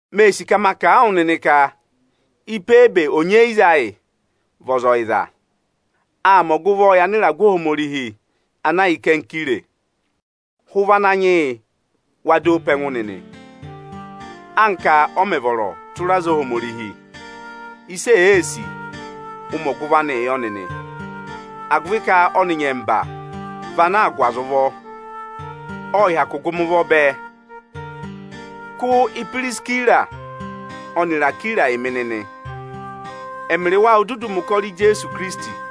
Mee sì ka ma kà a wụ nịnị ka Ipebe onyeyiza ayị vị ọza ọyịza; aa mẹ ọgụvọọ yị anịragụ Ohomorihi ana yà Ikenkire. Hụ ụvọ Ananyị yị wa dọ ọ pe ẹngụ nịnị, anka ọ mẹ̀ vọrọ tụra aza Ohomorihi! Ịsị èe sì, ụ mẹ ọgụvọ anịị yọ nịnị, agụvị ka ọnị nyẹmba vị anaā gụ aza ụvọ. Ọ hyakụụ gụ mị ụvọ bẹẹ. Kụ́ Ipirisira ọnịrị Akwira yị mị nịnị! Ẹmịrị wa ô dudu mẹ̀ ụkọrọ yị Ijeesu Ikirisiti.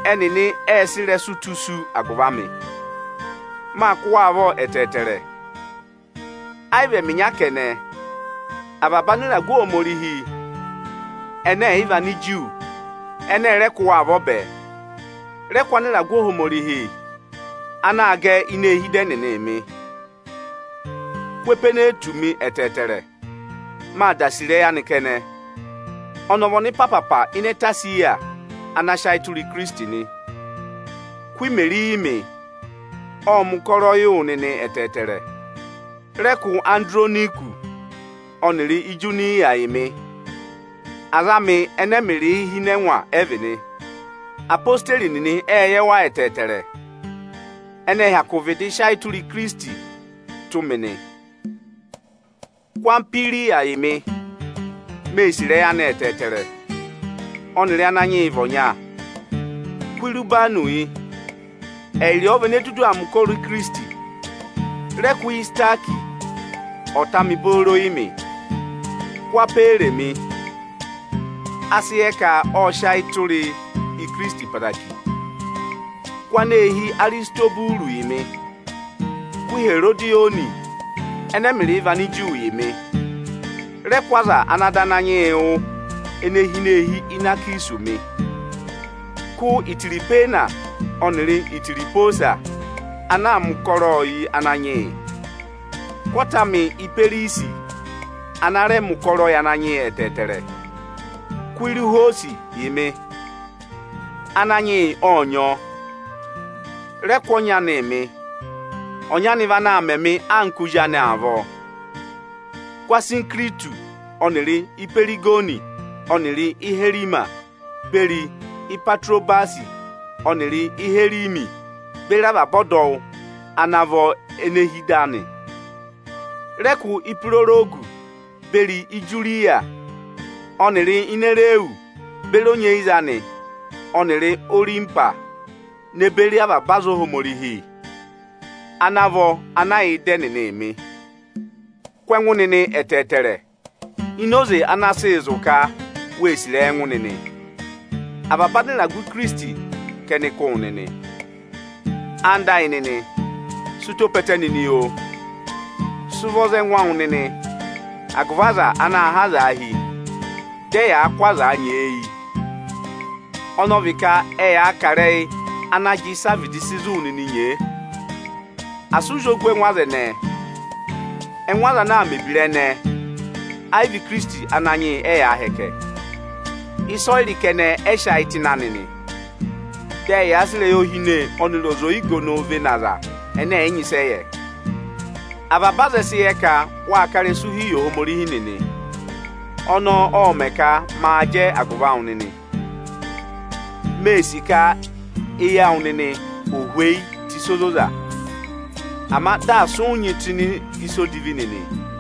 Ẹnịnị ệ sị ịrẹsụ tụ́ isu agụvị amị. Mâ kụ́ wa avọ ẹtẹẹtẹrẹ. Ẹ yị vị ẹmị ịnya kẹnẹ, avaba anịragụ Ohomorihi ẹnẹ ẹ̀ yị vị Aniju ẹnị ẹ rẹ kụ́ wa avọ bẹẹ. Rẹ kụ́ anịragụ Ohomorihi anaā gẹ ini eehi ịda ẹnịnị mị! Kụ́ Epeenetu mị ẹtẹẹtẹrẹ, mâ da sì ịrẹyị anị kẹnẹ. Ọnị ọ vị ọnịpaapa ịnị ẹtẹ Esiya ana sị ayị tụra Ikirisiti nị. Kụ́ Imeri yị mị! Ộ mẹ̀ ụkọrọ yị wụ nịnị ẹtẹẹtẹrẹ. Rẹ kụ́ Andironikusi ọnịrị Ijuniya yị mị! Aza amị ẹnẹ ẹmịrịị hi ịnị ẹngwa ẹ vị nị. Apositeri nịnị ệ yẹ wa ẹtẹẹtẹrẹ. Ẹnị ẹ hyakụ vịdị sị ayị tụra Ikirisiti tụ́ mị nị. Kụ́ Ampiriyatọsị yị mị! Mê sì ịrẹyị anị ẹtẹẹtẹrẹ. Ọnịrị Ananyị yị vị ọnya. Kụ́ Ụbanụsị yị! Ẹyịrị ọọ vị ene dudu aa mẹ̀ ụkọrọ Ikirisiti. Rẹ kụ́ Isitakisi ọta amị booro yị mị! Kụ́ Aperesi mị! A sị yẹ ka ộ sị ayị yị Ikirisiti ẹtẹẹtẹrẹ. Kụ́ aneehi Arisitoburu yị mị! Kụ́ Iherodiyoni ẹnẹ ẹmịrịị vị Aniju yị mị! Rẹ kụ́ aza ana dọ Ananyị yị wụ́ ene hi ini eehi Inakisusi mị! Kụ́ Itirihwena ọnịrị Itirihwosa ana aa mẹ ụkọrọọ yị Ananyị yị! kụ́ ọta amị Iperisi ana rẹ mẹ̀ ụkọrọ yị Ananyị yị ẹtẹẹtẹrẹ! Kụ́ Iruhwọọsị yị mị! Ananyị yị ộ nyị ọọ. Rẹ kụ́ ọnyị anịị mị! Ọnyị anị vị anaā mẹ mị anka ozi anị avọọ. Kụ́ Asinikiritusi ọnịrị Ihwiregoni ọnịrị Iherimasi beri Ipatirobasi ọnịrị Iherimesi beri avaba ọdọwụ ana vọ ene hi ịda anị! Rẹ kụ́ Ihwirorogusi beri Ijuriya ọnịrị Inerusi beri onyeyiza anị ọnịrị Orimpasi ne beri avaba aza Ohomorihi ana vọ ana yà ịda ẹnịnịị mị! Kụ́ ẹngụ nịnị ẹtẹẹtẹrẹ, ini oze ana sị zụ̀ ka wê sì ịrẹyị ẹngụ nịnị. Avaba anịragụ Ikirisiti ka ẹnị kụ́ wụ nịnị. Ẹwụ nịnị ẹyịnyara amị, sị ụtọ pe ẹtẹ nịnị, oo! Sị ụvọ za ẹngụ awụ nịnị agụvị aza anaā há azaa hi, di ẹyaa kụ́ azaa nyeeyi, ọnọọ vị ka ẹyaa kà ịrẹyị ana jị ịsị a vịdị sị zụ̀ wụ nịnị nyee. Asị ụ zị ògù ẹngụ aza ẹnẹẹ! Ẹngụ aza ana aa mẹ̀ ebira ẹnẹẹ, ẹyị vị Ikirisiti Ananyị yị ẹyaa hẹkẹ. Ịsa ọyịrị kẹnẹ ẹ sị ayị tụ́ ịnị anị nị. Dị ẹyaa sị ịrẹyị ohine ọnịrị ọza oyigonoo vene aza ẹnẹ ẹ̀ yị nyị ịsị ẹ yẹ. Avaba aza ẹ sị yẹ ka wâ ká ịrẹsụ hi yị Ohomorihi nịnị. Ọnọọ ộ mẹ̀ ka maa jẹ agụvị awụ nịnị. Mee sì ka eyi awụ nịnị ò hweyi tù ịsa ozoza, ama dị asị ụ nyị tụ́ ịnị ịsa odivi nịnị.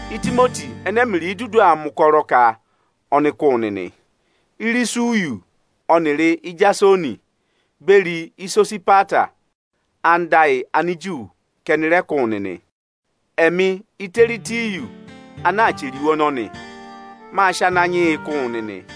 Itimoti ẹnẹ ẹmịrịị dudu aa mẹ̀ ụkọrọ ka ọnị kụ́ wụ nịnị. Irusiyọsị ọnịrị Ijasoni, beri Isosipata anda ayị Aniju ka ẹnị rẹ kụ́ wụ nịnị. Ẹmị Ịtẹtịyọsị ana chẹrẹ iwe ọnọnị, mâ sị Ananyị yị kụ́ wụ nịnị.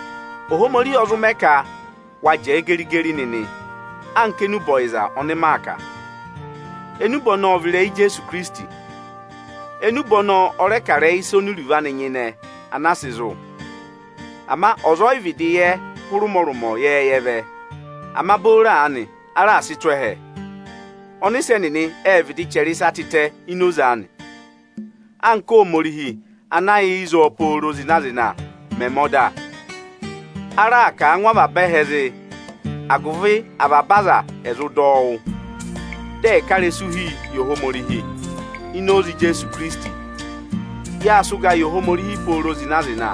Ohomorihi ọ zụ ka wa jẹẹ geri-geri nịnị anka enube ọyịza ọnị maa kà. Enube ọnọọ vị ịrẹyị Ijeesu Ikirisiti. Enube ọnọọ ọ rẹ kà ịrẹyị ịsa oni iruvo anị nyịnẹ anaa sị zụ̀. Ama ọza ẹ yị vịdị yẹ hụrẹ ụmọrụmọ ịnị ịyẹẹyẹ vẹ. Ama booro aanị a raà sị tụ́ ẹhẹ. Ọnịsẹ nịnị ệ vịdị chẹrẹ ịsa tịtẹ ini oze anị. Anka Óhomorihi ana yà ịzọọ pooro zịna-zịna mẹ̀ mẹ ọda, a raà kà a ngụ avaba ẹhẹ zị, agụvị avaba aza ẹ̀ zụ dọ wụ́, dị ẹ̀ẹ ká ịrẹsụụ hi yị Ohomorihi. Ini oze Ijeesu Ikirisiti, yâ sị ụga yị Ohomorihi pooro zịna-zịna,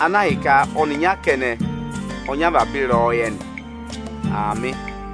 ana ahịka ọnịnya kẹnẹ ọ nyị avaba ịrẹyọyẹ nị. Aamị.